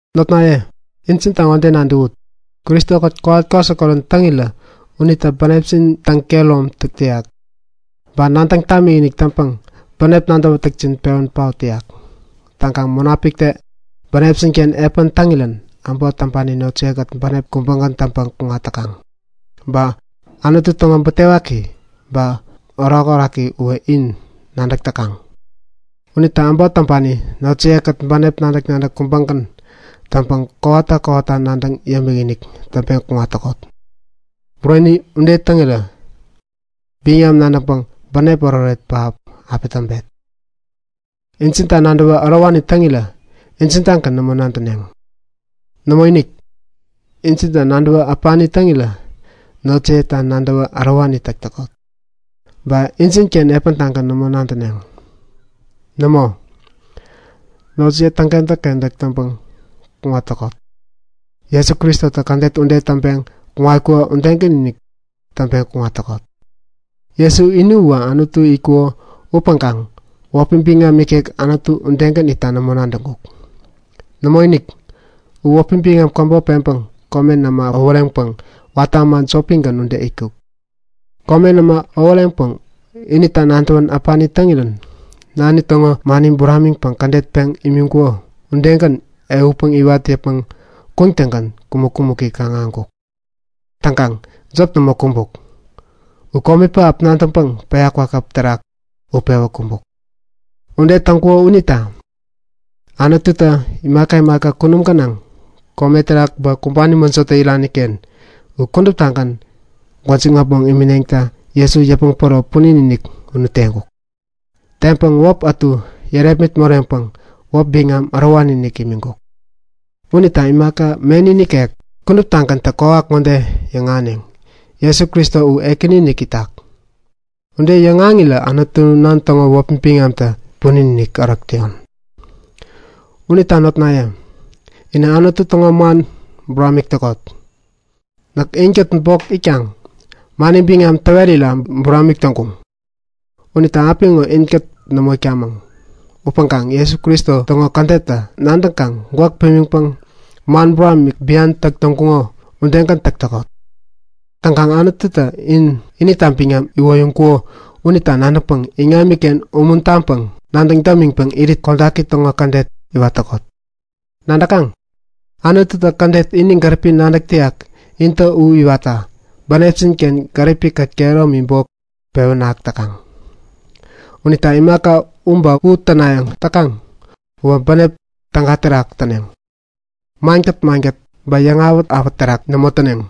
Notnaye, injinta ŋode nadäwut; Kristo-kät kowat-kwasikorän täŋirä unitä bänepjin täŋ-kehäromtak täyak, ba nadäŋ tamikinik täŋpäŋ bänep nadäwätäkjin pewän paot täyak. Täŋkaŋ Munapiktä bänepjin-ken epän täŋirän äbot täŋpani notjiye-kät bänep kubägän täŋpäŋ kuŋat täkaŋ. Ba Anutu täŋo butewaki ba orakoraki uwä in nadäk täkaŋ. Unita äbot täŋpani notjiye-kät bänep nadäk-nadäk kubägän täŋpäŋ kowata kowata nadäŋ yämikinik täŋpeŋ kuŋat täkot. Ude täŋpeŋ kuŋarirä biŋam nadäŋpäŋ bänep oretoret pähap api täŋpet. Injinta nadäwä ärowani täŋirän injin-tagän nämo nadäneŋ. Nämoinik! Injinta nadäwä äpani täŋirän notjiyeta nadäwä ärowani täk täkot. Ba injinken epäntagän nämo nadäneŋ. Nämo, notjiye täŋkentäk-kentäk täŋpäŋ kuŋat täkot. Jesu Kristotä kädet ŋode täŋpeŋ kuŋatkuko udegän-inik täŋpeŋ kuŋat täkot; Jesu ini uwä Anutu itkuko upäŋkaŋ wäpi biŋam ikek Anutu udegän itta nämo nadäŋkuk. Nämoinik! U wäpi biŋam käbop peŋpäŋ komen äma äworeŋpäŋ watä äma jopigän ude itkuk. Komen äma iŋam dapun terak äbäŋkaŋ inita nadäwän äpani täŋirän Nani täŋo mani buramiŋpäŋ kädet peŋ imiŋkuko ugän ehutpäŋ iwat yäpmäŋ kuŋtäŋgän kumäk-kumäki kaŋ-ahäŋkuk. Täŋkaŋ jop nämo kumbuk. U komi pähap nadäŋpäŋ päya kwakäp terak utpewä kumbuk. Ude täŋkuko unita Anututä imaka imaka kunum gänaŋ, kome terak ba kumbani mäjotä irani-ken u kuduptagän gwäjiŋ äpmoŋ imineŋta Jesu yäpmäŋ päro punin-inik unu teŋkuk. Teŋpäŋ wäp ätu yärepmit moreŋpäŋ wäp biŋam ärowani-inik imiŋkuk. Unita imaka meni nikek kuduptagäntä kwawak ŋode yäŋahäneŋ; Jesu Kristo u Ekäni-inik itak! Ude yäŋahäŋirä Anutu Nan täŋo wäpi biŋamtä punin-inik ärok täyon. Unita notnaye, inä Anutu täŋo man buramik täkot. Näk inkät bok itkaŋ mani biŋam täwerira buramik täŋkuŋ. Unita apiŋo inkät nämo itkamäŋ upäŋkaŋ Jesu Kristo täŋo kädetta nadäŋkaŋ gwäk pimiŋpäŋ man buramik bian täk täŋkuŋo udegän täk täkot. Täŋkaŋ Anututä in inita biŋam iwoyäŋkuko unita nadäŋpäŋ iŋamiken umuntaŋpäŋ nadäŋ dämiŋpäŋ irit kodaki täŋo kädet iwat täkot. Nadäkaŋ? Anututä kädet ini gäripi nadäk täyak intä u iwatta bänepjin-ken gäripikät kehäromi bok pewän ahäk täkaŋ. Unita imaka u ba u tänayäŋ täkaŋ uwä bänep täga terak täneŋ. Mankät-mankät ba yäŋwawak terak nämo täneŋ.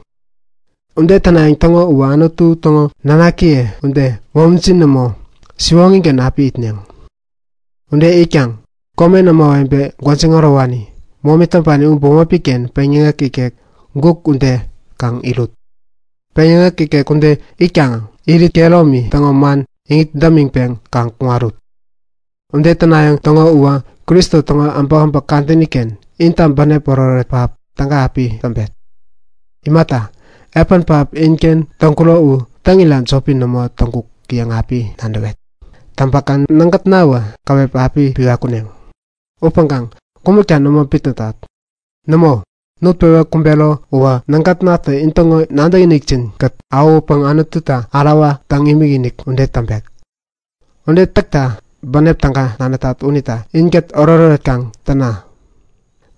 Ude tänayäŋ täŋo uwä Anutu täŋo nanakiye ude, momijin nämo, siwoŋigän api itneŋ. Ude itkaŋ komen ämawebe gwäjiŋ ärowani, momi täŋpani u bämopi-ken peŋyäŋek, guk ude kaŋ irut. Peŋyäŋek ude itkaŋä irit kehäromi täŋo man iŋit dämiŋpeŋ kaŋ kuŋarut. Ude tänayäŋ täŋo uwä Kristo täŋo äbäkäbäk kadäni-ken inta bänep oretoret pähap täga api täŋpet. Imata, epän pähap inken täŋkuro u täŋira jopi nämo täŋkuk yäŋ api nadäwet. Täŋpäkaŋ nägätna käwep api piwa kuneŋ. Upäŋkaŋ kumäkta nämo bitnätat. Nämo, nutpewä kumbero uwä nägätnatä intäŋo nadäkinikjin-kät awähutpäŋ Anututa ärawa täŋ-imikimik ude täŋpek. Ude täkta bänep täga nadätat unita inkät oretoret kaŋ täna!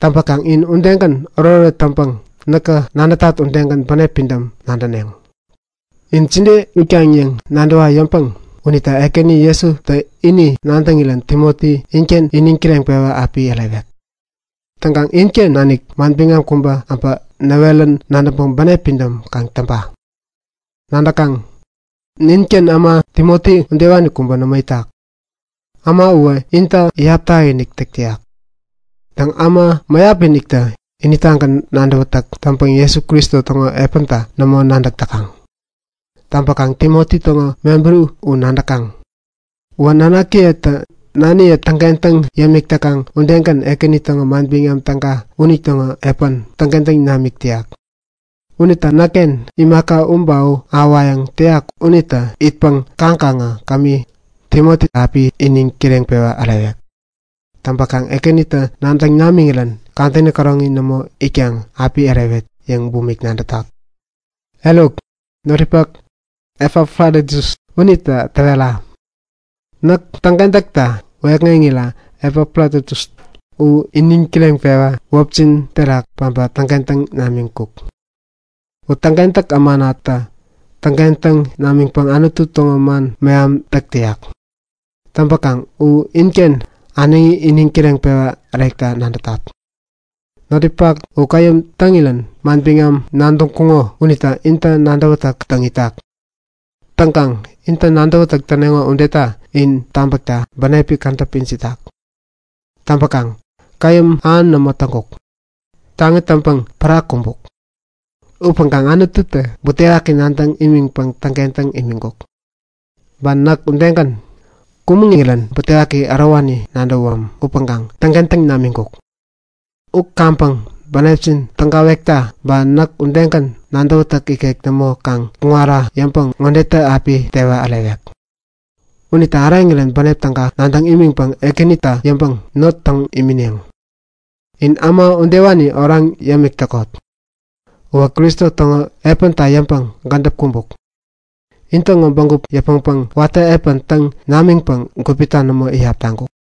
Täŋpäkaŋ in udegän oretoret täŋpäŋ näkä nadätat udegän bänep pidäm nadäneŋ. In jide itkaŋ yäŋ nadäwa yäŋpäŋ unita Ekäni Jesutä ini nadäŋirän Timoti inken iniŋ kireŋpewa api ärewek. Täŋkaŋ inken nanik manbiŋam kubä äbä näwerän nadäŋpäŋ bänep pidäm kaŋ täŋpa. Nadäkaŋ? Ninken äma Timoti udewani kubä nämo itak. Äma uwä inta iyap takinik täk täyak. Täŋ, äma mäyap-iniktä initagän nadäwätäk täŋpäŋ Jesu Kristo täŋo epänta nämo nadäk täkaŋ. Täŋpäkaŋ Timoti täŋo mebäri u nadäkaŋ. Uwä nanakiyetä naniye täŋkentäk täŋ yämik täkaŋ udegän Ekäni täŋo Manbiŋam Täga unitäŋo epän täŋkentäŋ namik täyak. Unita näkken imaka u ba u ahäwayäŋ täyak unita itpäŋ kaŋkaŋä kämi, Timoti api iniŋ kireŋpewa ärewek. Täŋpäkaŋ Ekänitä nadäŋ namänä kadäni käroŋi nämo itkaŋ api ärewet yäŋ nadätat. Eruk, notninpak Epafroditus unita täwerayäŋ. Näk täŋkentäkta wäyäkŋeŋira Epafroditus u iniŋ kireŋpewä wäpjin terak päbä täŋkentäŋ namiŋkuk. Täŋkentäk ämana unitä täŋkentäŋ namiŋpäŋ Anutu täŋo man meham täk täyak. Täŋpäkaŋ u inken äneŋi iniŋ kireŋpewa ärekta nadätat. Notninpak u käyäm täŋirän manbiŋam nadäŋkuŋo unita inta nadäwätäk täŋ itak. Täŋkaŋ intä nadäwätäk täneŋo udeta in tabäkta bänepi kädäp ijiŋ itak. Täŋpäkaŋ käyäm ähan nämo täŋkuk. Taŋi täŋpäŋ pära kumbuk. Upäŋkaŋ Anututä butewaki nadäŋ nimiŋpäŋ täŋkentäŋ imiŋirän nämo kumbuk. Kumbuk yäwänä butewaki ärowani nadäwam unita nek bok täŋkentäŋ nimiŋkuk yäŋ yäyat. U kaŋpäŋ bänepjin tägawekta ba näk udegän nadäwätäk ikek nämo kaŋ kuŋara yäŋpäŋ ŋodetä api tewa ärewek. Unitä äreŋirän bänep täga nadäŋ imiŋpäŋ Ekänita yäŋpäŋ not täŋ imineŋ. In äma udewani oraŋ yämik täkot. Uwä Kristo täŋo epänta yäŋpäŋ gädäp kumbuk. In täŋo bägup yäpmäŋpäŋ watä epän täŋ namiŋpäŋ gupita nämo iyap taŋkuk.